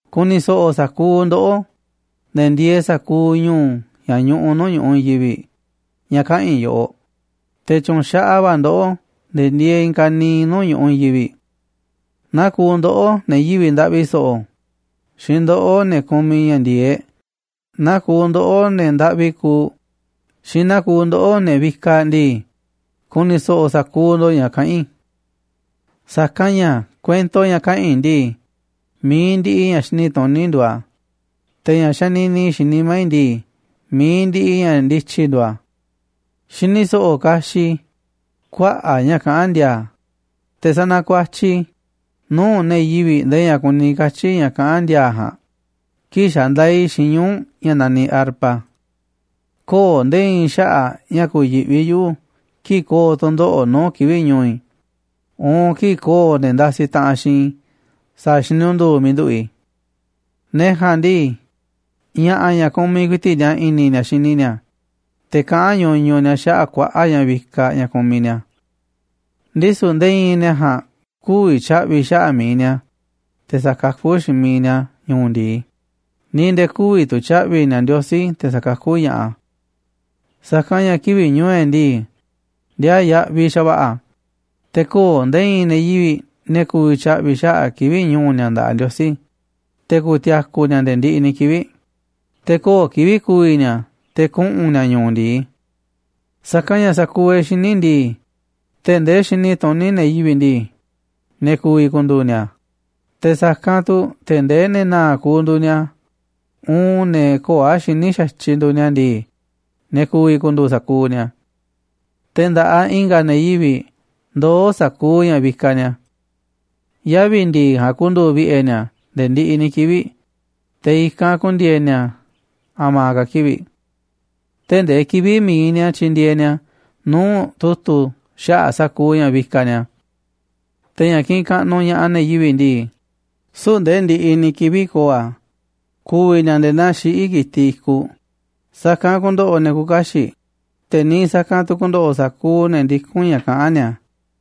Ku̱ni̱ so̱ꞌo̱ sa̱kuuꞌ ndoꞌó, ne̱ ndieeꞌ sa̱kuuꞌ ñu̱u̱ ña̱ ñuꞌuꞌ nuu̱ꞌ ñu̱ꞌuꞌ i̱i̱n yivi̱ꞌ ña̱ kaꞌa̱n i̱ yoꞌoꞌ, te̱ tyu̱nxaꞌaꞌ va̱ ndoꞌó, ne̱ ndieeꞌ i̱i̱n ka̱niiꞌ nuu̱ꞌ ñu̱ꞌuꞌ i̱i̱n yivi̱ꞌ. Naa kuuꞌ ndoꞌó, ne̱ yivi̱ꞌ ndaꞌvi so̱ꞌo̱, xiinꞌ ndoꞌó, ne̱ kumiꞌ ña̱ ndi̱e̱eꞌ, naa kuuꞌ ndoꞌó, ne̱ ndaꞌvi kuuꞌ, xiinꞌ naa kuuꞌ ndoꞌó, ne̱ vikaꞌ ndii, ku̱ni̱ so̱ꞌo̱ sa̱kuuꞌ ndo̱ꞌ ña̱ kaꞌán i̱. Sa̱kanꞌ ña̱ kuento ña̱ kaꞌa̱n i̱ ndii, mi̱iꞌ ndiꞌiꞌ ña̱ xini tuní nduuꞌ a̱, te̱ ña̱ xanini i̱ xiinꞌ nimá i̱ ndii, mi̱iꞌ ndiꞌiꞌ ña̱ ndityi nduuꞌ a̱. Xini so̱ꞌo̱ kaxiꞌ i̱ kuaꞌa̱ꞌ ña̱ kaꞌán ndi̱a̱a̱, te̱ sanakuatyiꞌ i̱ nuu̱ꞌ ne̱ yivi̱ꞌ ndee ña̱ kuni katyi̱ ña̱ kaꞌán ndi̱a̱a̱ ja̱a̱nꞌ kii̱ꞌ xandaaꞌ i̱ xiinꞌ ñuu̱ꞌ ña̱ naniꞌ arpa. Köo̱ꞌ nde̱e̱ i̱i̱n xaꞌa̱ꞌ ña̱ ku̱yi̱ꞌvi yuꞌu̱ kii̱ꞌ ko̱o̱ tu̱ndoꞌo̱ꞌ nuu̱ꞌ kivi̱ꞌ ñu̱u̱ i̱, uun kii̱ꞌ ko̱o̱ ne̱ ndasi taꞌanꞌ xiinꞌ sa̱a̱ xinundu̱u̱ miiꞌ nduꞌu̱ꞌ i̱. Ne̱ ja̱a̱nꞌ ndii, ña̱ꞌa̱ ña̱ kumiꞌ ku̱i̱ti̱ꞌ ni̱a̱ i̱ni̱ ni̱a̱ xini ni̱a̱, te̱ kaꞌán ñuñuꞌ ni̱a̱ xaꞌa̱ꞌ kuaꞌa̱ꞌ ña̱ vikaꞌ ña̱ kumiꞌ ni̱a̱. Ndisu̱ nde̱e̱ i̱i̱n ne̱ ja̱a̱nꞌ kü̱vi̱ tya̱ꞌvi̱ xaꞌa̱ꞌ mi̱iꞌ ni̱a̱, te̱ sa̱kakú xiinꞌ mi̱iꞌ ni̱a̱ ñu̱u̱ ndi̱i, ni̱ nde̱e̱ kü̱vi̱ tu̱ tya̱ꞌvi̱ ni̱a̱ Ndiosí te̱ sa̱kakú ña̱ꞌaꞌ a̱. Sa̱kanꞌ ña̱ kivi̱ꞌ ñu̱u̱ e̱ꞌ ndii, ndiaa yaꞌviꞌ xa̱va̱ꞌa̱ a̱, te̱ köo̱ꞌ nde̱e̱ i̱i̱n ne̱ yivi̱ꞌ ne̱ ku̱vi̱ tya̱ꞌvi̱ xaꞌa̱ꞌ kivi̱ꞌ ñu̱u̱ ni̱a̱ nda̱ꞌaꞌ Ndiosí, te̱ ku̱ti̱a̱ku̱ ni̱a̱ nde̱e̱ ndiꞌiꞌ ni̱ kivi̱ꞌ, te̱ köo̱ꞌ kivi̱ꞌ ku̱vi̱ ni̱a̱ te̱ kuꞌu̱n ni̱a̱ ñu̱u̱ ndi̱i. Sa̱kanꞌ ña̱ sa̱kuuꞌ e̱ꞌ xiní ndii, tee̱ꞌ ndee xini tuní ne̱ yivi̱ꞌ ndii, ne̱ ku̱vi̱ ku̱ndu̱u̱ ni̱a̱, te̱ sa̱kanꞌ tu̱ tee̱ꞌ ndee ne̱ na̱a̱ꞌ kuuꞌ nduuꞌ ni̱a̱ uun ne̱ köo̱ꞌ a̱ xiní xa̱tyiꞌ nduuꞌ ni̱a̱ ndii, ne̱ ku̱vi̱ ku̱ndu̱u̱ sa̱kuuꞌ ni̱a̱. Te̱ nda̱ꞌaꞌ i̱nga̱ ne̱ yivi̱ꞌ ndoó sa̱kuuꞌ ña̱ vikaꞌ ni̱a̱. Yavi̱ ndi̱i̱ ja̱a̱nꞌ ku̱ndu̱u̱ vi̱ꞌe̱ ni̱a̱ nde̱e̱ ndiꞌiꞌ ni̱ kivi̱ꞌ, te̱ i̱kanꞌ ku̱ndi̱e̱e̱ ni̱a̱ a̱ma̱ ka̱ kivi̱ꞌ, tee̱ꞌ ndee kivi̱ꞌ mi̱iꞌ ni̱a̱ tyi̱ndi̱e̱e̱ ni̱a̱ nuu̱ꞌ tu̱tu̱ xaꞌa̱ꞌ sa̱kuuꞌ ña̱ vikaꞌ ni̱a̱. Te̱ ña̱ kiꞌinꞌ kaꞌnuꞌ ña̱ꞌaꞌ ne̱ yivi̱ꞌ ndii, süu̱ꞌ nde̱e̱ ndiꞌiꞌ ni̱ kivi̱ꞌ ko̱o̱ a̱, ku̱vi̱ ni̱a̱ nde̱e̱ naa xiꞌí ki̱tiꞌ i̱kuꞌ. Sa̱kanꞌ ku̱ndo̱ꞌo̱ ne̱ küuꞌ kaxiꞌ, te̱ niiꞌ sa̱kanꞌ tu̱ ku̱ndo̱ꞌo̱ sa̱kuuꞌ ne̱ ndikún ña̱ kaꞌán ni̱a̱.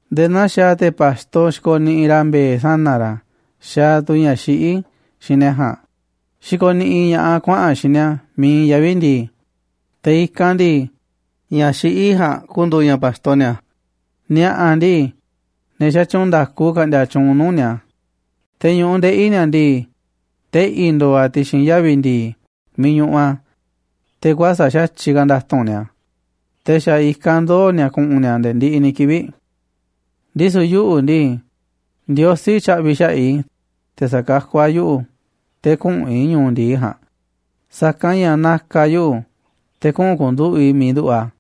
Nde̱e̱ naa xaaꞌ te̱ pa̱xto xikoniꞌiꞌ ra̱ mbe̱e̱ sana̱ ra̱ xaaꞌ tu̱ ña̱ xiꞌí xiinꞌ ne̱ ja̱a̱nꞌ xikoniꞌiꞌ ña̱ꞌaꞌ a̱ kuaꞌa̱n a̱ xiinꞌ ni̱a̱ miiꞌ iinꞌ yavi̱ ndi̱i̱, te̱ i̱kanꞌ ndii, ña̱ xiꞌí ja̱a̱nꞌ ku̱ndu̱u̱ ña̱ pa̱xto ni̱a̱. Ni̱a̱ꞌa̱ ndii, ne̱ xatyuunꞌ nda̱ku ka̱ꞌndi̱a̱ tyuunꞌ nuu̱ꞌ ni̱a̱, te̱ ñu̱ꞌuꞌ ndeꞌi̱ ni̱a̱ ndii, teꞌi̱ ndo̱o̱ a̱ ti̱xi̱n yavi̱ ndi̱i̱ miiꞌ ñuꞌuꞌ a̱, te̱ kuäsa̱ꞌ xa̱tyiꞌ ka̱ nda̱tu̱nꞌ ni̱a̱, te̱ xa̱ i̱kanꞌ ndoo̱ ni̱a̱ ku̱ꞌu̱n ni̱a̱ nde̱e̱ ndiꞌiꞌ ni̱ kivi̱ꞌ. Ndisu̱ yuꞌu̱ ndii, Ndiosí tya̱ꞌvi̱ xaꞌa̱ꞌ i̱, te̱ sa̱kakú a̱ yuꞌu̱ te̱ küꞌu̱n i̱ ñu̱u̱ ndi̱i ja̱a̱nꞌ, sa̱kanꞌ ña̱ na̱ka̱ a̱ yuꞌu̱ te̱ kuꞌu̱n ku̱nduꞌu̱ꞌ i̱ miiꞌ nduꞌu̱ꞌ a̱.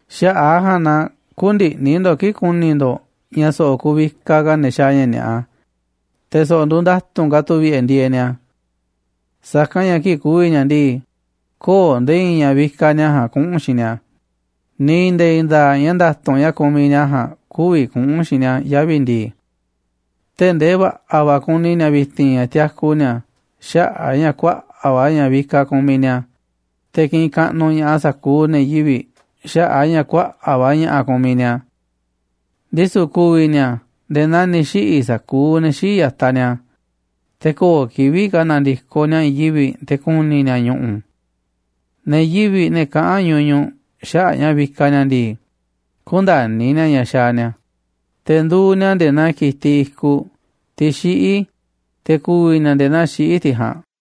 Xaꞌa̱ꞌ a̱ ja̱a̱nꞌ na kü̱ndi̱ꞌni̱ ndo̱ꞌ kii̱ꞌ ku̱ni̱ ndo̱ꞌ ña̱ so̱ꞌo̱ kuvikaꞌ ka̱ ne̱ xaaꞌ ña̱ ni̱a̱ꞌa, te̱ so̱ꞌo̱ nduuꞌ nda̱tu̱nꞌ ka̱ tu̱ vi̱ꞌe̱ ndieeꞌ ni̱a̱. Sa̱kanꞌ ña̱ kii̱ꞌ ku̱vi̱ ni̱a̱ ndii, köo̱ꞌ nde̱e̱ i̱i̱n ña̱ vikaꞌ ni̱a̱ ja̱a̱nꞌ kuꞌu̱n xiinꞌ ni̱a̱, ni̱ nde̱e̱ i̱i̱n nda̱a̱ꞌ ña̱ nda̱tu̱nꞌ ña̱ kumiꞌ ni̱a̱ ja̱a̱nꞌ kü̱vi̱ kuꞌu̱n xiinꞌ ni̱a̱ yavi̱ ndii. Tee̱ꞌ ndee va̱ꞌa̱ va̱ kuni ni̱a̱ vi̱ti̱n ña̱ tiaku ni̱a̱ xaꞌa̱ꞌ a̱ ña̱ kuaꞌa̱ꞌ va̱ ña̱ vikaꞌ kumiꞌ ni̱a̱, te̱ kiꞌinꞌ kaꞌnuꞌ ña̱ꞌaꞌ sa̱kuuꞌ ne̱ yivi̱ꞌ xaꞌa̱ꞌ a̱ ña̱ kuaꞌa̱ꞌ va̱ ña̱ꞌa̱ kumiꞌ ni̱a̱. Ndisu̱ ku̱vi̱ ni̱a̱ nde̱e̱ naa ni̱ xiꞌi̱ sa̱kuuꞌ ne̱ xii̱ꞌ ya̱taꞌ ni̱a̱, te̱ köo̱ꞌ kivi̱ꞌ ka̱ na̱ndi̱koꞌ ni̱a̱ i̱i̱n yivi̱ꞌ te̱ ku̱ni̱ ni̱a̱ ñu̱ꞌu̱. Ne̱ yivi̱ꞌ, ne̱ kaꞌán ñuñuꞌ xaꞌa̱ꞌ ña̱ vikaꞌ ni̱a̱ ndii, kündani̱ ni̱a̱ ña̱ xaaꞌ ni̱a̱, te̱ nduuꞌ ni̱a̱ nde̱e̱ naa ki̱tiꞌ i̱kuꞌ, tiꞌ xiꞌí, te̱ ku̱vi̱ ni̱a̱ nde̱e̱ naa xiꞌí tiꞌ ja̱a̱nꞌ.